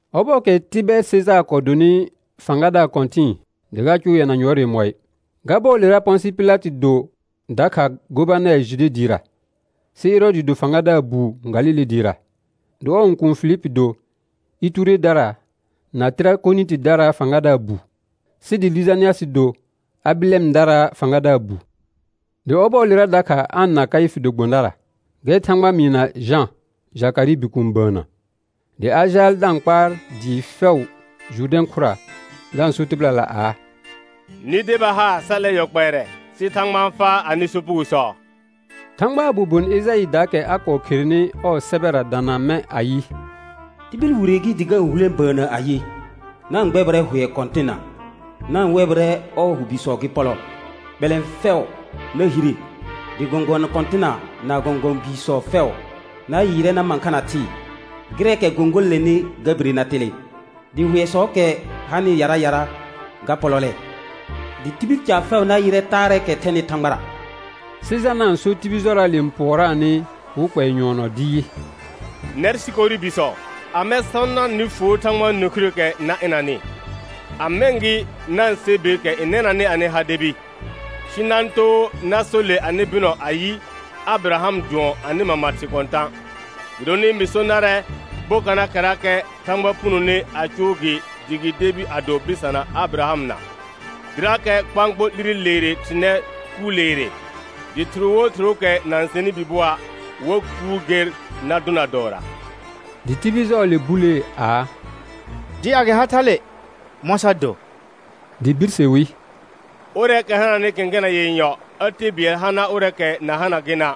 Ɔbɔɔkɛ Tɩbɛɛr Sejaar kɔɔ donɩ fãgadaar kɔ̃tɩ̃ɩ dɩ ga cʋʋ yɛna yʋɔr yemɔɩ, ga bɔɔlera Pɔ̃sɩ Pɩlatɩ do dakha gobanɛr Jude dɩɩra, sɩ Ɛrɔɔdɩ do fãgadaar buu Galile dɩɩra, dɩ ɔɔ õkuun Filipi do Ituredara na Tɩrakonɩtɩdaraa fãgadaar bu, sɩ dɩ Lɩjanɩasɩ do Abɩlɛndaraa fãgadaar bu; dɩ ɔbɔɔlera dakha An na Kaɩfɩ do gbõdara, gɛr Thãgba mɩɩna Jã, Jakarɩɩ bikuun, bəənnə. Dɩ a jaal da-n kpaar dɩɩ fɛʋ Jʋrdɛ̃ khʋra, da-n so tɩbɩlala aa: Nɩ deba haar sa 'lɛ yɔ kpɛɛrɛ, sɩ Thãgba n faa anɩ sopugosɔ. Thãgbaa bobon Ejaɩɩdaakɛ a kɔɔ kherenɩ ɔɔ sɛbɛra dana mɛ̃ ayɩ. «Tibil wire gɩ dɩ ga-n hulẽ bəənnə ayɩ: Na-n gbɛbɩrɛ hʋɛ Kɔ̃tɩnna, na-n wɛbɩrɛ ɔɔ hʋ bisɔ gɩ pɔlɔ. Bɛlɛ̃ɛ fɛʋ na hire, dɩ gɔ̃gɔ̃ kɔ̃tɩna na gɔ̃gɔ̃ biisɔ fɛʋ na yɩɩrɛ na mãkha na thɩɩ. Gɩrɛɛkɛ gõgolonenɩ ga bire na telẽ, dɩ hʋɛsɔɔkɛ hanɩ yara yara ga pɔlɔlɛ. Dɩ tibil caar fɛʋ na yɩrɛ taarɛɛkɛ thɛnɩ Thãgbara.» Sɩ Jana n sor tibil jɔraale n pʋɔraanɩ wɩ kpɛɛ nyʋɔnɔ dɩ yɩ: Nɛr sikori bisɔ, amɛ sɔ nar nɩ fuo Thãgbaa nĩkhirəəkɛ na ɩnanɩ? A mɛ̃ gɩ na-n sɛ beekɛ n nɛnanɩ anɩ ha debi, sɩ na-n too na so le anɩ bɩnɔ ayɩ, Abɩraham dʋɔn anɩ mama thɩ kɔ̃tã'. Gɩdonɩ mɩ so narɛ: Bokanaakɛrakɛ Thãgba punone a cʋʋ gɩ dɩ gɩ debi a do bɩsana Abɩrahamna. Dɩrakɛ kpãkpo 'lire leere thɩr nɛ kuur leere. Dɩ thɩr wo thɩrʋʋkɛ na-n sɛnɩ bi bʋɔa', wa kuur ger na dʋna dɔɔra. Dɩ tibil jɔɔle bulee aa: Dɩ a gɩ ha thale, mɔ̃ sa do? Dɩ birse wi: Ʋrɛɛkɛ hananɩ kẽkena yenyɔ, a te bɩɛl hana ʋrɛɛkɛ na hana gɩna';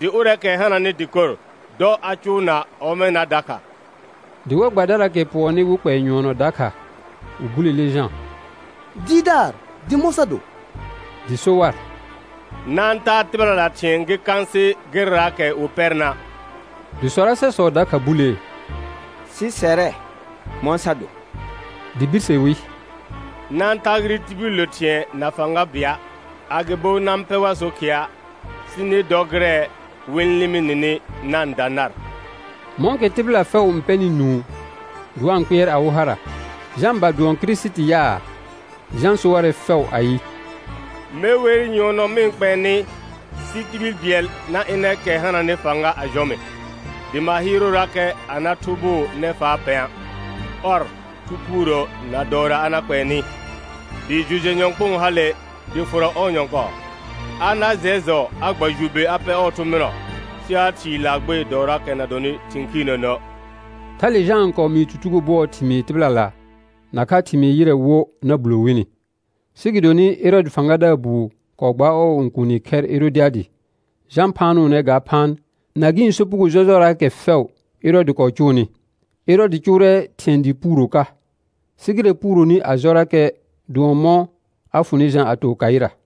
dɩ ʋrɛɛkɛ hananɩ dɩkor, dɔ a cʋʋna ɔmɛna dakha. Dɩ war gbadaraakɛ pʋɔnnɩ wɩ kpɛɛ nyʋɔnɔ dakha, wɩ bulele Jã: Dɩɩrdaar, dɩ mɔ̃ sa do? Dɩ so war: Na-n taa tɩbɩlala thɩ̃ɛ gɩ kãasɩ gɩrɛraakɛ wɩ pɛrna'. Dɩ sɔrasɛsɔ dakha bulee: Sɩ sɛrɛ, mɔ̃ sa do? Dɩ birse wi: Na-n tagɩrɩ tibillə thɩ̃ɛ na fãga bɩa', agɩbo na-n pɛ war so khɩa', sɩ nɩ dɔ gɩrɛ wɩ-n lɩmɩ nɩnɩ na-n da nar. Mɔ̃kɛ tɩbɩla fɛʋ n pɛnɩ nũu dɩ wa-n kpɩɛr awɩ hara, Jã ba dʋɔn Kirisiti yaa, Jã so warɛ fɛʋ ayɩ: Me wer nyʋɔnɔ mɩ-n kpɛɛ nɩ, sɩ tibil bɩɛl na ɩnɛ kɛ hananɩ fãga a jɔ mɩ, dɩ ma hɩɩrʋʋrakɛ a na thʋbʋʋ nɛfaa pɛ̃a'. Ɔr, Thu Phuurə na dɔɔra a na kpɛɛ nɩ. Dɩ jʋ jɛ nyɔ̃kpʋʋn hale dɩ fʋrɔ ɔɔ nyɔ̃kɔɔ. A na jɛr jɔ a gba jʋ be a pɛ ɔɔ thʋ̃ bɩnɔ, sɩ a thii laagbee dɔɔraakɛ na dɔnɩ thɩ̃ khiirnənə'. Thale Jã n kɔɔ mɩɩ tutugo bʋɔɔ thɩmɩɩ tɩbɩlala nakha thɩmɩɩ ƴɩrɛ wo na bulo wini. Sɩ gɩdonɩ Ɛrɔɔdɩ fãgadaar buu kɔɔ gbaar ɔɔ õkuuni khɛr Ɛrɔdɩadɩ, Jã phaanʋʋnɛ ga phaan, na gɩ̃ sopugo jɔjɔraakɛ fɛʋ Ɛrɔɔdɩ kɔɔ cʋʋnɩ. Ɛrɔɔdɩ cʋʋrɛ thɩ̃ɛ dɩɩ puuro ka, sɩ gɩrɛ puuroni a jɔrakɛ dʋɔn mɔ̃ a fʋnɩ Jã a to khaɩra.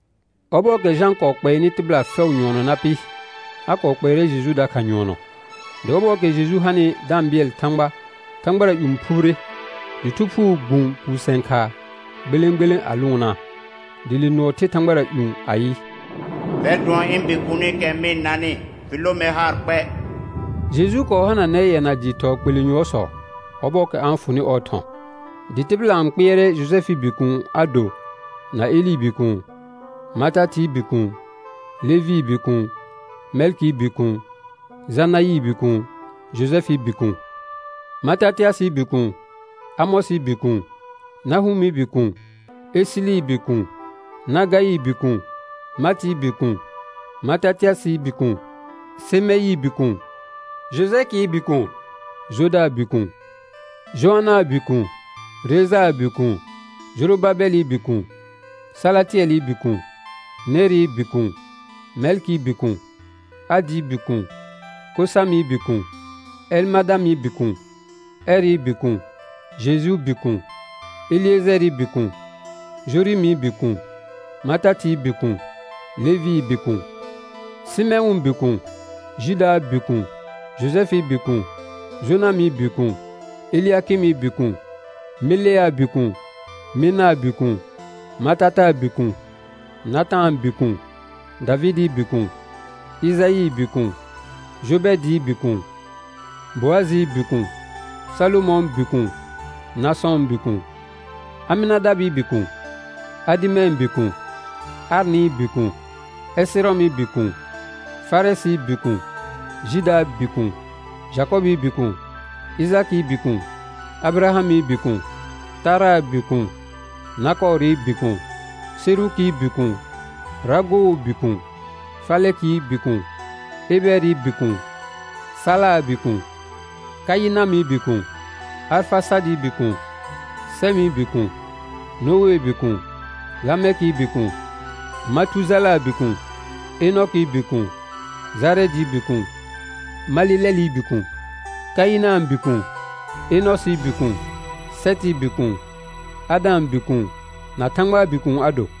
Ɔbɔɔkɛ Jã kɔɔ kpɛɛnɩ tɩbɩla fɛʋ nyʋɔnɔ na pɩ, a kɔɔ kpɛɛrɛ Jeju dakha nyʋɔnɔ. Dɩ ɔbɔɔkɛ Jeju hanɩ da-n bɩɛl Thãgba, thãgbara ƴũ phubire. Dɩ Thu Phuu gbũ puusɛ̃ khaa gbelẽ gbelẽ a lʋʋnaa. Dɩ le nʋɔ the thãgbara ƴũ ayɩ: Fɛr dʋɔn ɩ̃ Bikuunikɛ mɩ-n nanɩ, fɩ lõ mer haar kpɛ. Jeju kɔɔ hananɛ yɛna dɩɩ thɔɔ kpelẽ yʋɔrsɔ, ɔbɔɔkɛ a fʋnɩ ɔɔ thɔ̃. Dɩ tɩbɩla n kpɩɛrɛ Jojɛfɩɩ bikuun a do na Elɩɩ bikuun, Matatɩɩ bikuun, Levɩɩ bikuun, Mɛlkɩɩ bikuun, Janaɩɩ bikuun, Jojɛfɩɩ bikuun, Matatɩasɩɩ bikuun, Amɔsɩɩ bikuun, Nahʋmɩ bikuun, Esɩlɩɩ bikuun, Nagaɩɩ bikuun, Matɩɩ bikuun, Matatɩasɩɩ bikuun, Semeɩɩ bikuun, Jojɛkɩɩ bikuun, Jodaa bikuun, Joanãa bikuun, Rejaa bikuun, Jorobabɛlɩ bikuun, Salatɩɛlɩ bikuun, Nerɩɩ bikuun, Mɛlkɩɩ bikuun, Adɩɩ bikuun, Kosamɩ bikuun, Ɛlmadamɩ bikuun, Ɛrɩ bikuun, Jejuu bikuun, Elɩɛjɛɛrɩ bikuun, Jorɩmɩ bikuun, Matatɩɩ bikuun, Levɩɩ bikuun, Sɩmɛ̃ʋʋ bikuun, Judaa bikuun, Jojɛfɩɩ bikuun, Jonamɩ bikuun, Elɩakɩmɩ bikuun, Meleaa bikuun, Menaa bikuun, Matataa bikuun, Natãa bikuun, Davɩdɩɩ bikuun, Ɩjaɩɩ bikuun, Jobɛɛdɩɩ bikuun, Boajɩɩ bikuun, Salomɔ̃ɔ bikuun, Nasɔ̃ɔ bikuun, Amɩnadabɩɩ bikuun, Adɩmɛ̃ɛ bikuun, Arnɩɩ bikuun, Ɛsɩrɔmɩ bikuun, Farɛsɩɩ bikuun, Judaa bikuun, Jakɔbɩɩ bikuun, Ɩjakɩɩ bikuun, Abɩrahamɩ bikuun, Taraa bikuun, Nakɔɔrɩ bikuun, Serukii bikuun, Ragoo bikuun, Falɛkɩɩ bikuun, Ebɛɛrɩ bikuun, Salaa bikuun, Kaɩnamɩ bikuun, Arfasaadɩɩ bikuun, Sɛmɩ bikuun, Noee bikuun, Lamɛkɩɩ bikuun, Matujalaa bikuun, Enɔkɩɩ bikuun, Jarɛɛdɩɩ bikuun, Malelɛlɩ bikuun, Kaɩnãa bikuun, Enɔsɩɩ bikuun, Sɛtɩɩ bikuun, Adãa bikuun, na Thãgbaa bikuun a do.